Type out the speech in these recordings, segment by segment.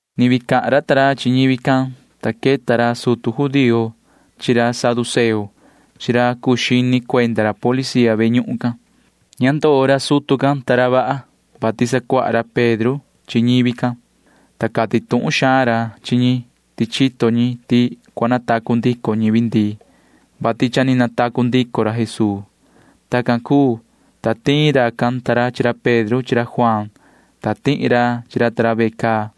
Ni vii cahan ra Pedro ta ra chi ñivi can, ta queta ra sutu judío ta ra chi ra saduceo chi ra cuu xini cuenda ra policía ve ñuhun cahnu can. Ña ndoo ra sutu ta ra vaha, vati sacuaha ra Pedro ta ra chi ñivi can, ta cati tuhun xaan ra chi ñi ti chito ñi ti cua natacu ndico ñivi ndii, vati cha ni natacu ndico ra Jesuu. Tacan cuu, ta tiin racan ta ra chi ra Pedro chi ra Juaan, ta tihi ra chi ra ta ra ve caa.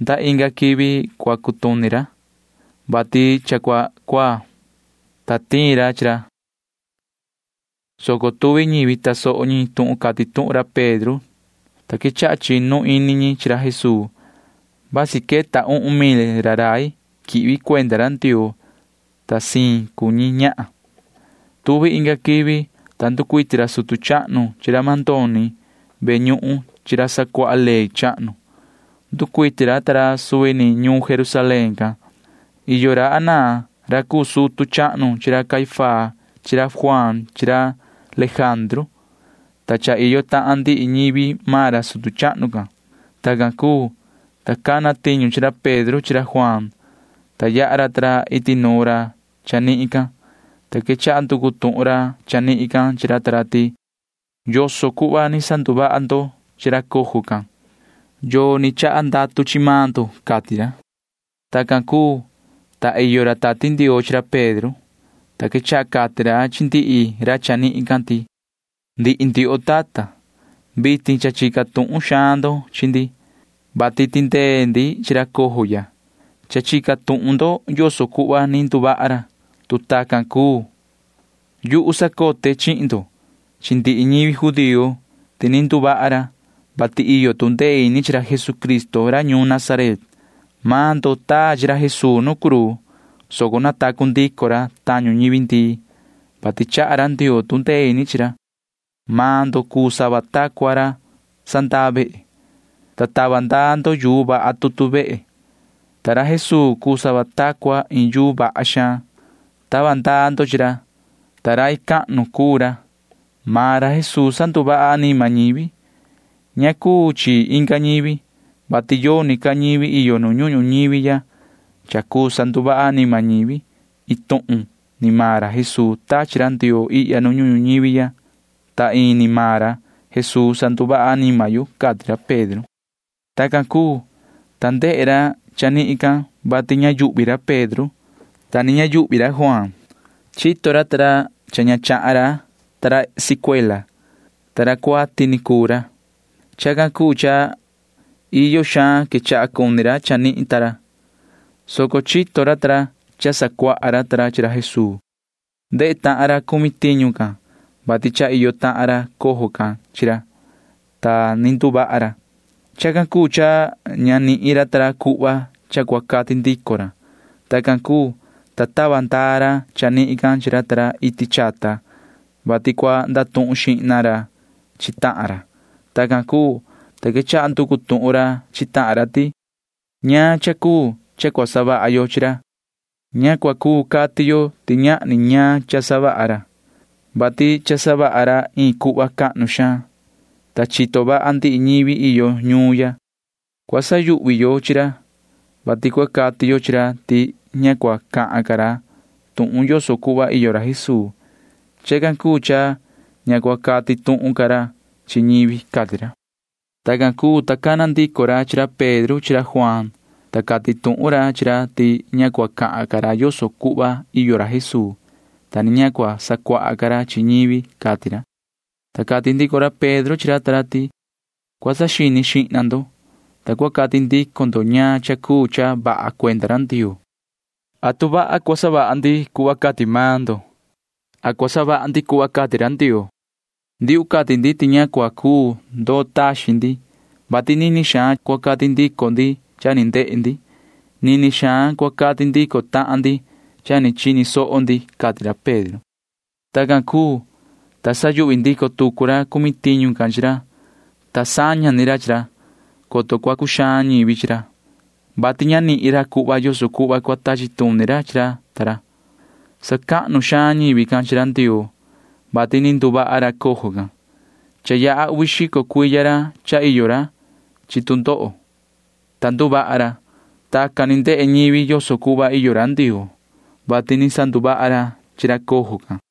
Nda inga quivi cua cutuni ra, vati cha cua cuaa, ta tiin ra chi ra, soco tuvi ñivi tasoho ñi tuhun cati tuhun ra Pedro ta ra, ta quechaha chinu ini ñi chi ra Jesuu. Vasi queta uhun mil ra rai quihvi cuenda ra Ndioo, ta siin cuu ñi ñahan. Tuvi inga quivi, ta nducuiti ra sutu chahnu chi ra mandoni ve ñuhun chi ra sacuaha ley chahnu. Nducuiti ra ta ra suvi ni ñuun Jerusalén can. Iyo ra Anaa ra cuu sutu chahnu chi ra Caifás chi ra Juaan chi ra Lejandru, ta cha iyo tahan ndihi ñivi maan ra sutu chahnu can. Tacan cuu, ta cana tiñu chi ra Pedro chi ra Juaan, ta yaha ra ta ra iti nuun ra chanihin can, ta quechaha nducu tuhun ra chanihin can chi ra ta ra ti: ―¿Yoso cuhva ni sanduvaha ndo chi ra cojo can? ¿Yoo ni chaha ndatu chihin maan ndo? ―cati ra. Tacan cuu, ta iyo ra Tati Ndioo chi ra Pedro, ta quechaha cati ra chi ndihi ra chanihin can ti: ―Ndihi ndioho tata, vitin cha chica tuhun xaan ndo chi ndi, vati tindee ndi chi ra cojo ya. Cha chica tuhun ndo yoso cuhva ni nduvaha ra. Tu tacan cuu, yuhu sacote chihin ndo chi ndihi ñivi judío ti ni nduvaha ra, vati iyo tu ndee ini chi ra Jesucristo ra ñuun Nazaret. Maan ndo taa chi ra Jesuu nu cruu, soco natacu ndico ra tañu ñivi ndii, vati chaha ra Ndioo tu ndee ini chi ra. Maan ndo cuu sava ta cua ra sandaa vehe, ta tava ndaa ndo yuu vaha tutu vehe, ta ra Jesuu cuu sava ta cua iin yuu vaha xaan. Tava ndaa ndo chi ra, ta rai cahnu cuu ra. Maan ra Jesuu sanduvaha anima ñivi. Ña cuu chi inga ñivi, vati yoni ca ñivi iyo nu ñuhun ñuñivi ya cha cuu sanduvaha anima ñivi. Iin tuhun ni maan ra Jesuu tachi ra Ndioo ihya ñuhun ñuñivi ya, ta ini maan ra Jesuu sanduvaha anima yo ―cati ra Pedro. Tacan cuu, ta ndehe ra chanihin can vati ña yuhvi ra Pedro, ta ni ña yuhvi ra Juaan. Chito ra ta ra cha ña chahan ra ta ra sicuela, ta ra cuati ni cuu ra. Chacan cuu cha iyo xaan quechaha cuni ra chanihin ta ra, soco chito ra cha sacuaha ra ta ra chi ra Jesuu. Ndehe tahan ra cumi tiñu can vati cha iyo tahan ra cojo can chi ra, ta ni nduvaha ra. Chacan cuu cha ña nihin ra ta ra cuhva cha cua cati ndico ra. Tacan cuu, ta tava ndaa ra chanihin chi ra ta ra iti chata, vati cua ndatuhun xihna ra chi tahan ra. Tacan cuu, ta quechaha nducu tuhun ra chi tahan ra ti: ―¿Ñaan cha cuu cha cua savaha yo chi ra? Ña cua cuu cati yo ti ñahni ñaan cha savaha ra, vati cha savaha ra iin cuhva cahnu xaan, ta chito vaha ndihi ñivi iyo ñuun ya. Cua sayuhvi yo chi ra, vati cua cati yo chi ra ti ña cua cahan ca ra tuhun yoso cuhva iyo ra Jesuu. Chacan cuu cha ña cua cati tuhun ca ra chi ñivi ―cati ra. Tacan cuu, ta cana ndico ra chi ra Pedro chi ra Juaan, ta cati tuhun ra chi ra ti ña cua cahan ca ra yoso cuhva iyo ra Jesuu, ta ni ña cua sacuaha ca ra chi ñivi, cati ra. Ta cati ndico ra Pedro chi ra ta ra ti: ―Cua saxini xihna ndo, ta cua cati ndico ndo ñaan cha cuu cha vaha cuenda ra Ndioo. ¿Atu vaha cua savaha ndi cuhva cati maan ndo? ¿Atu vaha cua savaha ndi cuhva cati ra Ndioo? Ndiuhu cati ti ña cua cuu ndoo taxin ndi, vati nini xaan cua cati ndico ndi cha ni ndehe ndi. Nini xaan cua cati ndico tahan ndi cha ni chini soho ndi ―cati ra Pedro. Tacan cuu, ta sayuhvi ndico tucu ra cumi tiñu can chi ra, ta saña ni ra chi ra, coto cua cuxaan ñivi chi ra, vati ña nihin ra cuhva yoso cuhva cua tachi tuni ra chi ra ta ra. Sacahnu xaan ñivi can chi ra Ndioo, vati ni nduvaha ra cojo can. Cha yaha uvi xico cuiya ra cha iyo ra chi tu ndoho, ta nduvaha ra. Tacan ni ndehe ñivi yoso cuhva iyo ra Ndioo, vati ni sanduvaha ra chi ra cojo can.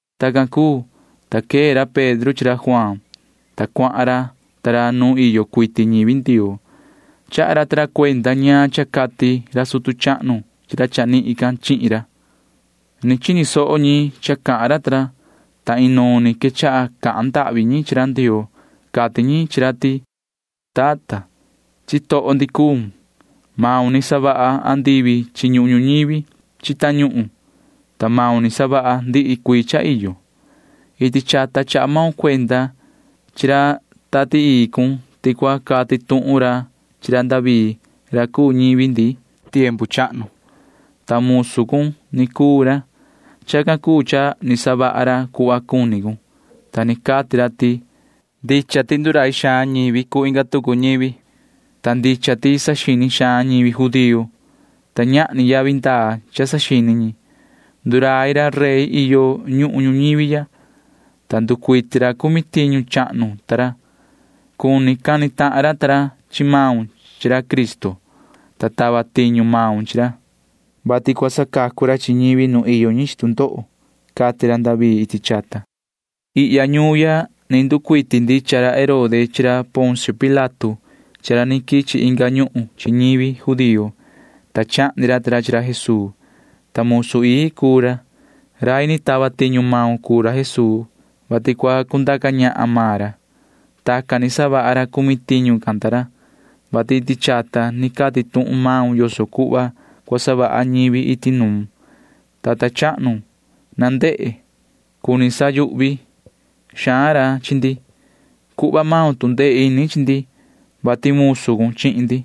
Tacan cuu, ta quee ra Pedro chi ra Juaan, ta cuahan ra ta ra nu iyo cuiti ñivi Ndioo. Chaha ra ta ra cuenda ñaan cha cati ra sutu chahnu chi ra chanihin can chihin ra. Ni chini soho ñi cha cahan ra ta ra, ta inuun ni quechaha cahan ndahvi ñi chi ra Ndioo. Cati ñi chi ra ti: ―Yoho tata, chitoho ndi cuun. Maun ni savaha andivi chi ñuhun ñuñivi chi tañuhun, ta maun ni savaha ndihi cuii cha iyo. Iti chata chaha maun cuenda chi ra Tati Ii cun ti cua cati tuhun ra chi ra David ra cuu ñivi ndi tiempu chahnu, ta musu cun ni cuu ra. Chacan cuu cha ni savaha ra cuhva cuni cun, ta ni cati ra ti: Ndicha ti ndurai xaan ñivi cuu inga tucu ñivi, ta ndicha ti saxini xaan ñivi judío, ta ñahni yavi ndaa cha saxini ñi. Ndurai ra rey iyo nu ñuhun ñuñivi ya, ta nducuiti ra cumi tiñu cahnu ta ra. Cuni cani tahan ra ta ra chi maun chi ra Cristo, ta tava tiñu maun chi ra, vati cua sacacu ra chi ñivi nu iyo ñi chi tu ndoho, cati ra David iti chata. ’Ihya ñuun ya ni nducuiti ndicha ra Herode chi ra Poncio Pilato chi ra ni quichi inga ñuhun chi ñivi judío, ta chahni ra ta ra chi ra Jesuu, ta musu ii cun cuu ra. Rai ni tava tiñu maun cuu ra Jesuu, vati cua cundaca ñahan maan ra. Tacan ni savaha ra cumi tiñu can ta ra, vati iti chata ni cati tuhun maun yoso cuhva cua savaha ñivi iti nuun. Yoho tata chahnu, na ndehe. Cuni sayuhvi xaan ra chi ndi. Cuhva maun tu ndee ini chi ndi, vati musu cun chihin ndi.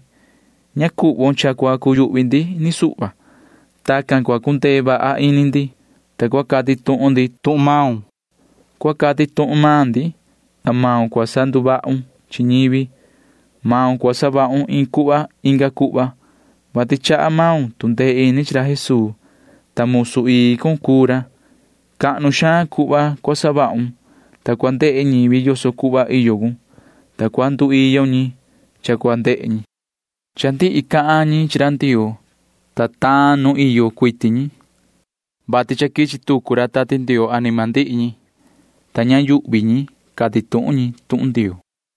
Ña cuhvon cha cua cuyuhvi ndi ni suhva. Tacan cua cundee vaha ini ndi, ta cua cati tuhun ndi tuhun maun. Cua cati tuhun maan ndi, ta maun cua sanduvahun chi ñivi. Maun cua savahun iin cuhva inga cuhva, vati chaha maun tu ndee ini chi ra Jesuu, ta musu ii cun cuu ra. Cahnu xaan cuhva cua savahun, ta cua ndehe ñivi yoso cuhva iyo cun, ta cua nduiyo ñi cha cua ndehe ñi. Cha ndihi cahan ñi chi ra Ndioo, ta taan nu iyo cuiti ñi, vati cha quichi tucu Tati Ndioo anima ndihi ñi, ta ña yuhvi ñi cati tuhun ñi tuhun Ndioo.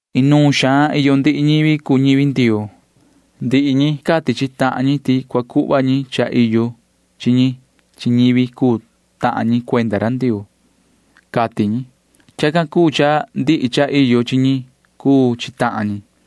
Inuun xaan iyo ndihi ñivi cuu ñivi Ndioo. Ndihi ñi cati chi tahan ñi ti cua cuhva ñi cha iyo chi ñi chihin ñivi cuu tahan ñi cuenda Ndioo, cati ñi. Chacan cuu cha ndihi cha iyo chi ñi cuu chi tahan ñi.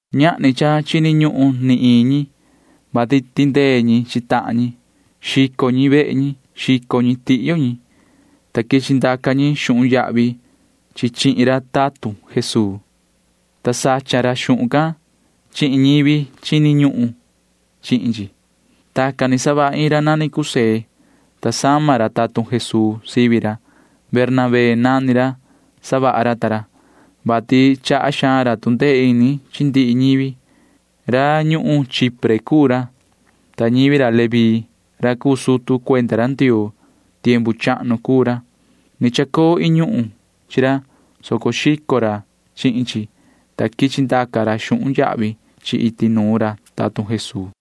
Ñahni cha chini ñuhun ni iin ñi, vati tindee ñi chi tahan ñi. Xico ñi vehe ñi. Xico ñi tihyo ñi, ta quichi ndaca ñi xuhun yahvi chi chihin ra tatun Jesuu, ta sacha ra xuhun can chihin ñivi chini ñuhun chihin chi. Tacan ni savaha iin ra nani José, ta sama ra tatun Jesuu sivi ra. Bernabé nani ra savaha ra ta ra, vati chaha xaan ra tu ndee ini chi ndihi ñivi. Ra ñuhun Chipre cuu ra, ta ñivi ra Leví ra cuu sutu cuenda ra Ndioo tiempu chahnu cuu ra. Ni chacoo iin ñuhun chi ra, soco xico ra chihin chi, ta quichi ndaca ra xuhun yahvi chi iti nuun ra tatun Jesuu.